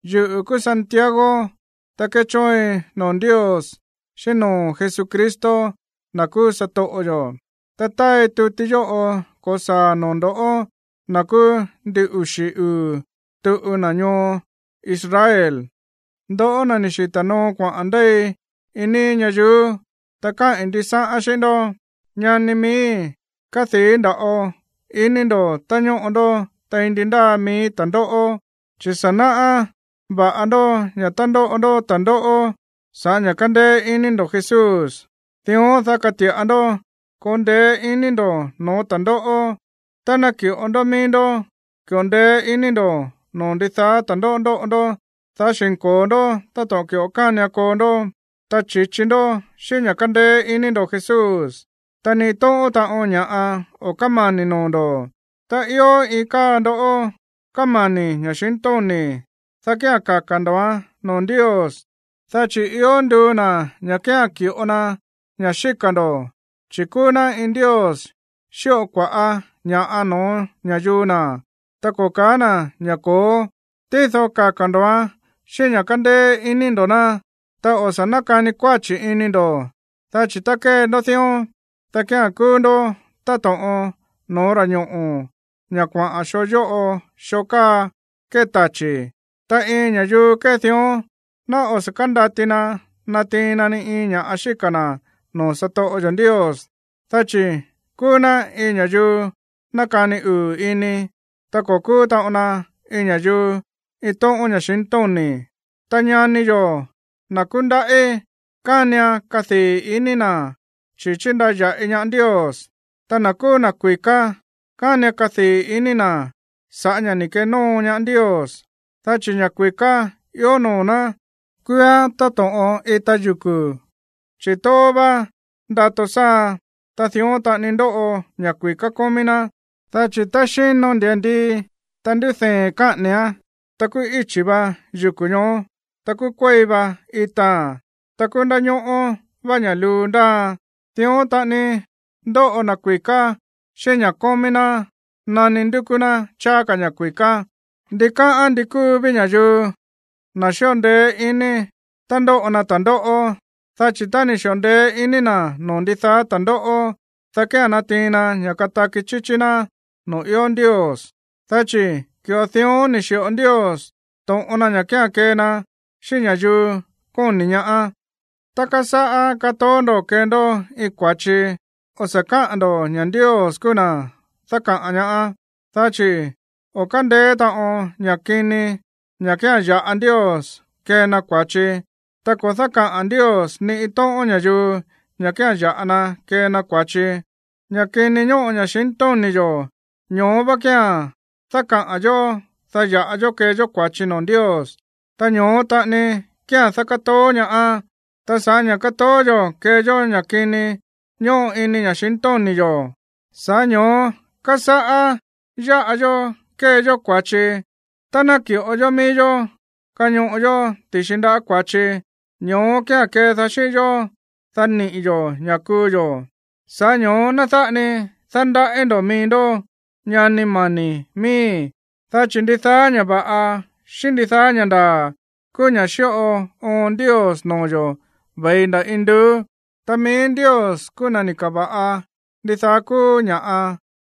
Yuꞌu̱ kúú Santiago, ta kéchóoin noo̱ Ndios xíꞌín noo̱ Jesucristo, na̱ kúú satoꞌo yo̱. Ta táai tuti yóꞌo ko̱saa̱a̱n noo̱ ndo̱ꞌó, na̱ kúú ndin uxi̱ uu̱ tuꞌu na̱ ñoo Israel, ndoꞌó na̱ ni̱ xita̱ noo kuaꞌa̱n ndéi iin níí ñayuú. Ta káꞌi̱n ndisáꞌán xíꞌín ndó. Ñani miíi̱, kadii̱ nda̱ꞌo ini ndo̱ tá ñóꞌo ndó tein ndi ndáa mií ta̱ndóꞌó. Chi̱ sa̱ náꞌá va̱ꞌa ndó ña̱ tá ndóꞌo ndó ta̱ndóꞌó sa̱ꞌá ña̱ kándéé iní ndo̱ Jesús, dión dá kati̱ꞌa ndó koo ndeé iní ndo̱ no̱ó ta̱ndóꞌó. Tá naki̱ꞌo ndó mií ndó ki̱ꞌo ndeé iní ndo̱ noo̱ ndi ndáa ta̱ndóꞌó ndoꞌo ndó, dá xi̱nko̱o ndó táto̱ꞌon ki̱ꞌo kánian koo ndó, ta chi̱chi ndó xíꞌín ña̱ kándéé iní ndo̱ Jesús, ta ni iin tóꞌón taꞌon ña̱ꞌa o̱ kámani̱ noo̱ ndo̱. Tá ió iin káa ndoꞌó kámani̱ ña̱xintóni̱, dá kía̱n kaka̱ ndo̱án noo̱ Ndios, dá chi̱ ió nduu na̱ ña̱ kía̱n ki̱ꞌo na ña̱ xíka̱ ndo̱, chi̱ kúú ná iin Ndios xíꞌo kua̱ꞌá ña̱ꞌa no̱ó ña̱yuu na̱, ta ko̱ ka̱á na̱ ña̱ ko̱ó. Tído kaka̱ ndo̱án xíꞌín ña̱ kándéé iní ndo̱ ná. Ta o̱ sa̱ nákani kuáchi̱ ini ndo̱, dá chi̱ tá kée ndó dión, dá kía̱n kúú ndó táto̱ꞌon no̱ó ta̱ñoꞌo̱, ña̱ kuaꞌa̱n xoo yóꞌo xoo káa kée tachi̱. Ta iin ña̱yuu kée dión ná o̱ sa̱ kándati na natiin na ni iin ña̱ꞌa xíka̱ na̱ noo̱ satoꞌo yo̱ Ndios, dá chi̱ kúú ná iin ña̱yuu nákani uu̱ ini, ta ko̱ kúú taꞌon na iin ña̱yuu iin tóꞌón ña̱xintóni̱. Ta ñani yo̱, na̱ kúndaꞌí, kánian kadii̱ ini na̱ chi̱ chindaya̱ꞌi ñaá Ndios. Ta na̱ kúú na̱ kui̱ká, kánian kadii̱ ini na̱ sa̱ꞌá ña̱ ni̱ kenóo ñaá Ndios, dá chi̱ ña̱ kui̱ká ió noo̱ ná kúúán táto̱ꞌon ita yuku̱, chi̱ tóó vá ndato sáaan, ta dión taꞌani ndoꞌo ña̱ kui̱ká kómí ná. Dá chi̱ tá xíno ndia̱ndii, ta ndúdee̱n káꞌa̱ni̱án, ta kúú íchi̱ vá yuku̱ ñoó, ta kúú kuéi va itaa̱n, ta kúú ndáñóꞌó vá ña̱ luu ndáaan. Dión taꞌani ndoꞌo na̱ kui̱ká xíꞌín ña̱ꞌa kómí ná nani ndúkú ná cháá ka̱ ña̱ kui̱ká. Ndikáꞌán ndi kúu ví ña̱yuu, na̱ xíꞌo ndeé ini tá ndóꞌo na ta̱ndóꞌó, dá chi̱ tá ni̱ xi̱ꞌo ndeé iní na̱ noo̱ ndidaá ta̱ndóꞌó, dá kía̱n natiin na ña̱ kataki chíchí ná noo̱ ió Ndios. Dá chi̱ ki̱ꞌo dión ni̱ xi̱ꞌo Ndios to̱ꞌon na ña̱ kía̱n kee na xíꞌín ña̱yuu kóni̱ ñaá. Tá kasáꞌá katoó ndo̱ kee ndó iin kua̱chi, o̱ sa̱ káꞌán ndo̱ ña̱ Ndios kúú na̱ dákaꞌa̱n ñaá, dá chi̱ o̱ kándeé taꞌon ña̱ kini ña̱ kía̱n ya̱ꞌa Ndios kee na kua̱chi, ta ko̱ dákaꞌa̱n Ndios ni iin tóꞌón ña̱yuu ña̱ kía̱n ya̱ꞌa na kee na kua̱chi. Ña̱ kini ñóꞌo ña̱xintóni̱ yo̱, ño̱ó vá kía̱n dákaꞌa̱n yo̱, dá yáꞌa yó kée yó kua̱chi noo̱ Ndios, ta ño̱ó taꞌani kía̱n dákátoó ñaá. Ta sa̱ꞌá ña̱ kátoó yo̱ kée yó ña̱ kini ñóꞌo ini ña̱xintóni̱ yo̱, sa̱ꞌá ño̱ó kásáꞌá yáꞌa yó kée yó kua̱chi. Tá náki̱ꞌo yó mií yó kañoꞌo yó ti̱xi ndáꞌa̱ kua̱chi, ño̱ó kía̱n kédaá xíꞌín yó, dá niꞌi̱ yo̱ ña̱ kuu yo̱. Sa̱ꞌá ño̱ó, ná dáꞌa ni dándaꞌí ndo̱ mií ndó, ñani mani̱ miíi̱. Dá chi̱ ndidaá ña̱ va̱ꞌa, xíꞌín ndidaá ña̱ ndaa̱ kúú ña̱ xíꞌo oon Ndios noo̱ yo̱ ve̱i nda̱ induú. Ta mií Ndios kúú na̱ ni̱ ka̱va̱ꞌa ndidaá kúú ña̱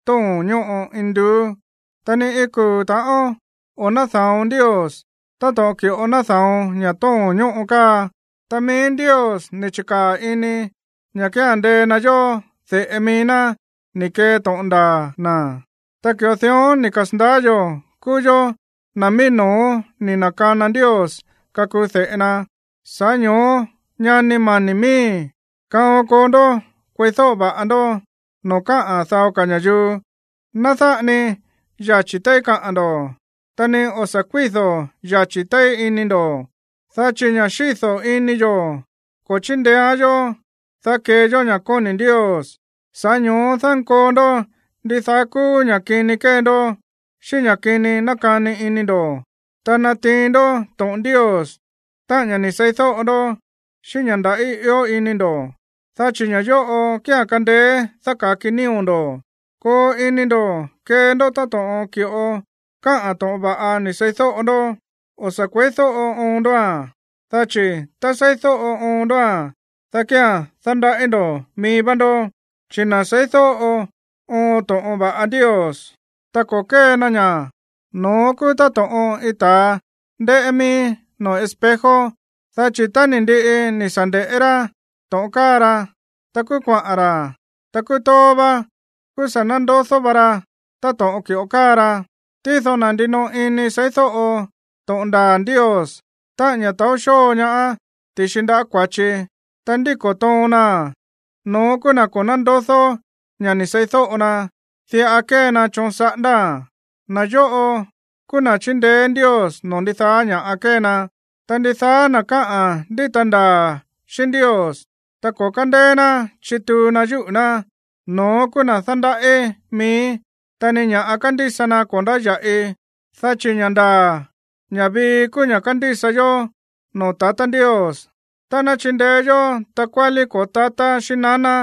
tóo̱n ñóꞌo induú. Ta ni iin kuu̱ ta̱ꞌón o̱ náda̱on Ndios, táto̱ꞌon ki̱ꞌo náda̱on ña̱ tóo̱n ñóꞌo káa. Ta mií Ndios ni̱ chi̱kaa̱ ini ña̱ kía̱n ndee na yó de̱ꞌe mií ná ni̱ kee to̱ꞌon ndaa̱ na̱. Ta ki̱ꞌo dión ni̱ kasa̱ndaá yo̱ kúú yó na̱ mií no̱ó ni̱ na̱kana Ndios kakuu de̱ꞌe na. Sa̱ꞌá ño̱ó, ñani mani̱ miíi̱, kaon koo ndó kueídóꞌo va̱ꞌa ndó noo̱ káꞌa̱n dao ka̱ ña̱yuu. Ná dáꞌa ni yachi̱ téí kaꞌa̱n ndo̱, ta ni o̱ sa̱ kuído̱ yachi̱ téí ini ndo̱. Dá chi̱ ña̱ xído̱ ini yo̱ ko̱ chíndeéán yó, dá kee yó ña̱ kóni̱ Ndios. Sa̱ꞌá ño̱ó dánkoo ndó ndidaá kúú ña̱ kini kée ndó, xíꞌín ña̱ kini nákani ini ndo̱, ta natiin ndó to̱ꞌon Ndios, táꞌa̱n ña̱ ni̱ seídóꞌo ndó, xíꞌín ña̱ ndaꞌí ió ini ndo̱. Dá chi̱ ña̱ yóꞌo kía̱n kándéé dáka̱ki nío̱ ndo̱. Koo ini ndo̱ kee ndó táto̱ꞌon ki̱ꞌo káꞌa̱n to̱ꞌon va̱ꞌa ni̱ seídóꞌo ndó. O̱ sa̱ kue̱ídóꞌo oon ndóa̱n, dá chi̱ tá seídóꞌo oon ndóa̱n, dá kía̱n dándaꞌí ndo̱ mií vá ndó. Chi̱ na̱ seídóꞌo oon to̱ꞌon va̱ꞌa Ndios, ta ko̱ kée na ña̱, no̱ón kúú táto̱ꞌon iin ta̱a ndéꞌé mií noo̱ espejo. Dá chi̱ tá ni̱ ndiꞌi ni̱ sa̱ nde̱ꞌé rá to̱ꞌon káa ra, ta kúú kuaꞌa̱n ra̱. Ta kúú tóó vá, kúú sa̱ na̱ndodó va ra táto̱ꞌon ki̱ꞌo káa ra. Tído na̱ ndinoꞌo ini seídóꞌo to̱ꞌon ndaa̱ Ndios, táꞌa̱n ña̱ taó xóo ñaá ti̱xi ndáꞌa̱ kua̱chi, ta ndíko̱ toon naa̱n, no̱ón kúú na̱ ko̱ nándodó ña̱ ni̱ seídóꞌo na. Diꞌa kée na choon saꞌándáa̱n. Na̱ yóꞌo kúú na̱ chíndeé Ndios noo̱ ndidaá ña̱ kée na. Ta ndidaá na̱ káꞌán ndíta ndaa̱ xíꞌín Ndios, ta ko̱ kándéé ná chituu na yúꞌu̱ ná, no̱ón kúú na̱ dándaꞌí mií, ta ni ña̱ kándísa na ko̱ ndáya̱ꞌi. Dá chi̱ ña̱ ndaa̱, ña̱ vii kúú ña̱ kándísa yó noo̱ tatá Ndios tá ná chindeé yó takuálí ko̱ó tatá xíꞌín naná,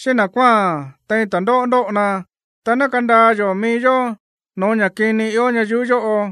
xíꞌín na̱ kuáa̱n tein ta̱ndóꞌó ndóꞌo na, ta ná kandaa yo̱ mií yó no̱ó ña̱ kini ió ñayuú yóꞌo.